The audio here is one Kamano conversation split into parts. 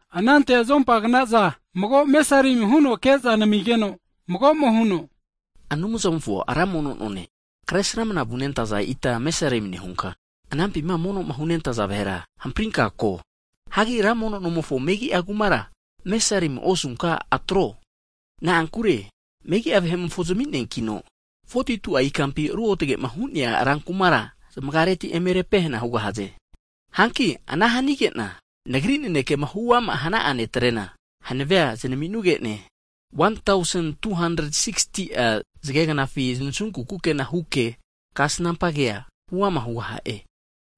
Anante mago azota anteno mesarim huno ke'za nenamigeno mago'mo huno, Anumzamofo ra mono none, kresramna vunentaza ita azota antenka mesarim nehunka, anampima monoma hunentaza vahera, hamprinka ko. Hagi ra mono nomofo megi'a kumara aozota antenka mesarimia osunka atro, na'ankure megia vahe'mofo zamineankino, 42'a ikampi ruotgema hu'nea rankumara, zmagareti eme repehana hugahaze. Hanki ana hanige'na Nagri nanekema huama hana'a netrena, hanavea zanaminuge'ne, 1,260'a zgegnafi znasunku kukena huke, kasnampa kea huama hugaha'e.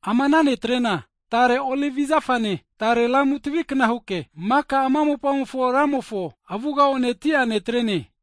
Ama ana netrena, tare olivi zafane, tare lamu tavikna huke, maka ama mopamofo Ramofo avugama oneti'a netrene.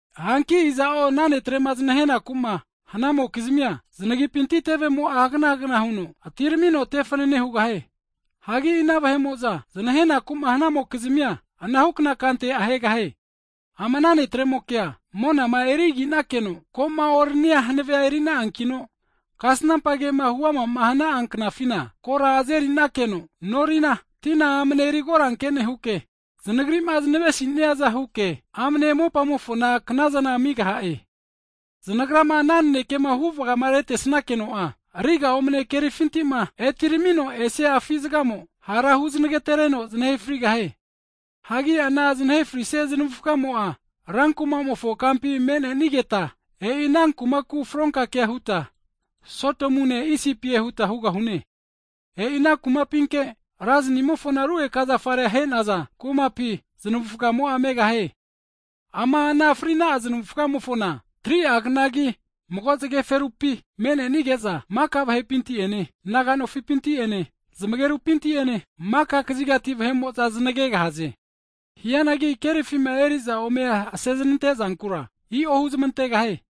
Hanki iza'o ana netre'ma znahenakuma hanamokizmia, znagipinti tevemo'a hagana hagana huno atiramino ana vahera tefanane hugahie. Hagi ina vahe'mo'za znahenaku'ma hanamokizmia, anahukna kante ahegahie. Ama ana netremokea monama eriginakeno koma noranigeno hanavea erina'ankino, kasnampa kema huamama hana'a knafina, kora azerinakeno norina, tina amne erikoranke nehuke, znagrima znavesisiaza huke amne mopamofona knazana amigaha'e. Znagrama ana nanekema huvgamaretesakeno'a, riga omane kerifintima etiramino esia afi zgamo hara huznagatereno znahe frigahie. Hagi ana znahe frisia znavufamo'a, rankuma'mofo kampi me'nenigeta, e'i ana kumaku fronka ke huta Sodomune Isipie huta hugahune. E'ina kumapinke Ra zanimofona rugeka zafare ahe'naza kumapi, znavufgamo'a megahie. Ama ana fri'na'a znavufgamofona 3'a knagi mago zgeferupi mene'nige'za, maka vahepinti'ene, naga nofipinti'ene, zmagerupinti'ene, maka kazigati vahe'mo'za znagegahaze. Hianagi kerifima eriza ome aseznante zankura i'o huzmantegahie.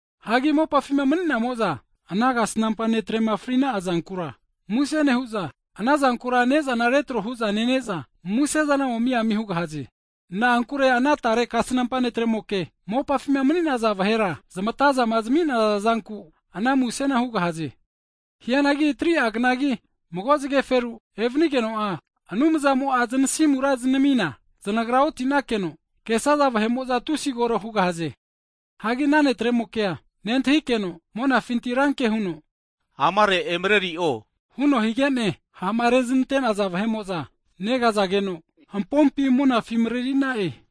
Hagi mopafima mni'namo'za ana kasnampa netrema frina'a zankura musena nehu'za, ana zankura nezana retro hu'za nene'za, musezana omi ami hugahaze. Na'ankure ana tare kasnampa netremoke mopafima mani'naza vahera zmatazama zminaza zanku, ana musena hugahaze. Hianagi 3'a knagi mago zgeferu evanigeno'a, Anumzamo'a zanasimura znamina, znagra otinake'no, kesaza vahe'mo'za tusi kore hugahaze. Hagi ana netre'mokea nentahikeno, monafinti ranke huno, amare emareri'o huno higene, ha'ma reznante'naza vahe'mo'za negazageno, hampompi monafi marerina'e.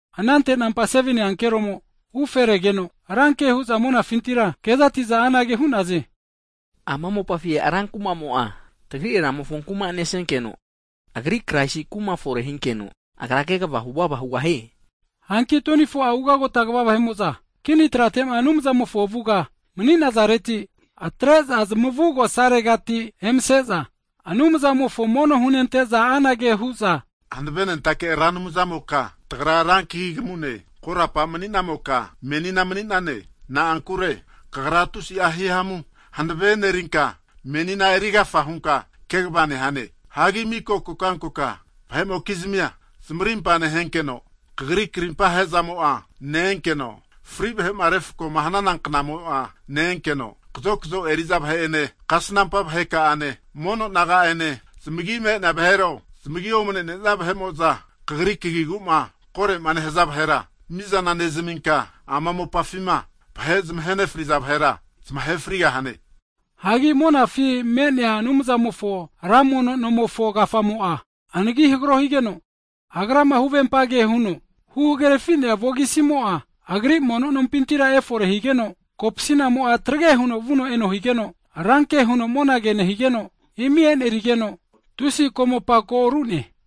Anante nampa 7ni ankeromo ufe regeno, ranke hu'za monafintira kezati'za anage hu'naze, Ama mopafi rankumamo'a, tagri Ramofo kuma nesenkeno, Agri Kraisi kuma fore hinkino, Agra kini manino kegva huvava hugahie. Hanki 24'a ugagota kva vahe'mo'za kini tratema Anumzamofo avuga mni'nazareti, atre'za zmavugosaregati emase'za, Anumzamofo mono hunente'za, anage hu'za, hanave nentake Ra Anumzamoka, tagra rankagi kamune, korapa mni'namoka, menina mani'nane, na'ankure Kagra tusi'a hihamu hanave e'nerinka, menina erigafa hunka kini maninka kegva nehane. Hagi miko kokankoka vahe'mokizmia zmarimpa nehenkeno, Kagri karimpa hezamo'a ne-enkeno, fri vahema refkoma hanana knamo'a ne-enkeno, kazokzo eriza vahe'ene kasnampa vaheka'ane mono naga'ene zamagi me'nenia vahero, zamagi omnene'nia vahe'mo'za Kagri kagiguma korema nehaza vahera mizana nezaminka, ama mopafima vahe zmahenefriza vahera, zmahe frigahane. Hagi monafima me'nea Anumzamofo ra mono nomofo kafamo'a anagi hagro higeno, Agrama huvempa ke huno huhagerafi'nea vogisimo'a, Agri mono nompintira efore higeno, kopasinamo'a trege huno vuno eno higeno, ranke huno monage nehigeno, imi e'nerigeno, tusi ko'mopa ko ru'ne.